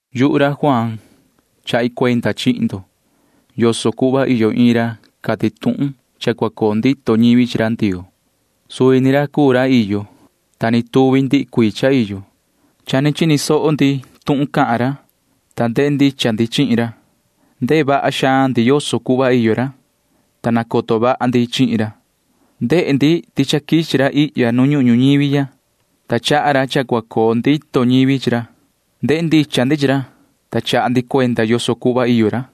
Yuhu ra Juaan chaha cuenda chihin ndo yoso cuhva iyo iin ra cati tuhun cha cua coo ndito ñivi chi ra Ndioo. Suvi ra cuu ra iyo, ta ni tuvi ndihi cuii cha iyo. Cha ni chini soho ndi tuhun cahan ra, ta ndehe ndicha ndi chihin ra. Ndehe vaha xaan ndi yoso cuhva iyo ra, ta nacoto vaha ndi chihin ra. Ndehe ndi ti cha quichi ra ihya nu ñuhun ñuñivi ya, ta chaha ra cha cua coo ndito ñivi chi ra. Ndehe ndicha ndi chi ra, ta chaha ndi cuenda yoso cuhva iyo ra.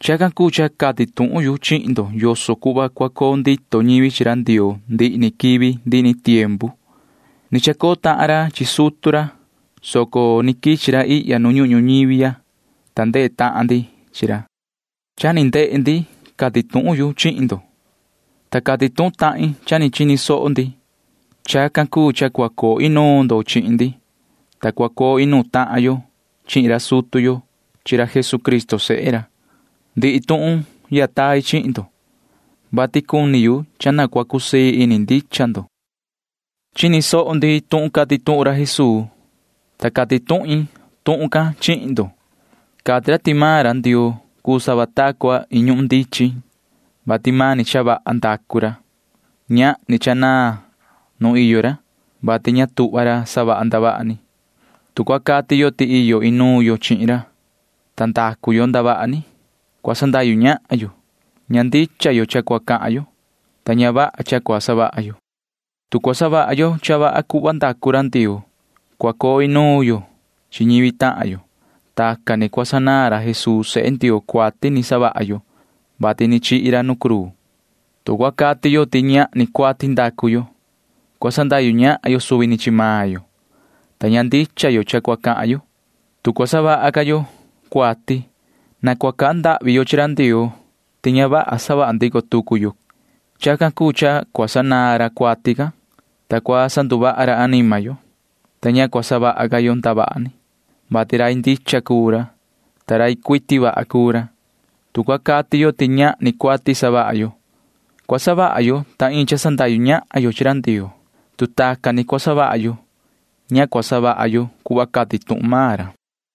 Chacan cuu cha cati tuhun yu chihin ndo yoso cuhva cua coo ndito ñivi chi ra Ndioo ndihi ni quivi ndihi ni tiempu. Ni chacoo tahan ra chi sutu ra, soco ni quichi ra ihya nu ñuhun ñuñivi ya, ta ndehe tahan ndi chi ra. Cha ni ndehe ndi cati tuhun yu chihin ndo, ta cati tuhun tahin cha ni chini soho ndi. Chacan cuu cha cua coo inuun ndo chihin ndi, ta cua coo inuun tahan yo chihin ra sutu yo chi ra Jesucristo sehe ra. Ndihi tuhun ya tai chihin ndo, vati cuni yu cha na cua cusii ini ndicha ndo. Chini soho ndi tuhun cati tuhun ra Jesuu, ta cati tuhun main tuhun can chihin ndo. Cati ra ti maan ra Ndioo cuu sava ta cua iin ñuhun ndichin, vati mani cha vaha ndacu ra. Ñahni cha naan nu iyo ra, vati ña tuhva ra savaha ra ndavaha ni. Tu cua cati yo ti iyo inuun yo chihin ra, ta ndacu yo ndavaha ni, cua sandahyu ñahan yo. Ña ndicha yo cha cua cahan yo, ta ña vaha cha cua savaha yo. Tu cua savaha yo cha vaha cuhva ndacu ra Ndioo, cua coo inuun yo chi ñivi tahan yo. Tacan ni cua sanaan ra Jesuu sehe Ndioo cuati ni savaha yo, vati ni chihi ra nu cruu. Tu cua cati yo ti ñahni cuati ndacu yo, cua sandahyu ñahan yo suvi ni chi maan yo, ta ña ndicha yo cha cua cahan yo. Tu cua savaha ca yo cuati, na cua cahan ndahvi yo chi ra Ndioo ti ña vaha yo savaha ndico tucu yo cuati. Chacan cuu cha cua sanaan ra cuati can, ta cua sanduvaha ra anima yo, ta ña cua savaha ca yo ndavaha ni, vati rai ndicha cuu ra, ta rai cuiti vaha cuu ra. Tu cua cati yo ti ñahni cuati savaha yo, cua savaha yo sava ta cua iin cha sandahyu ñahan ra Ndioo. Tu tacan ni cua savaha yo, ña cua savaha yo cuhva cati tuhun maan ra.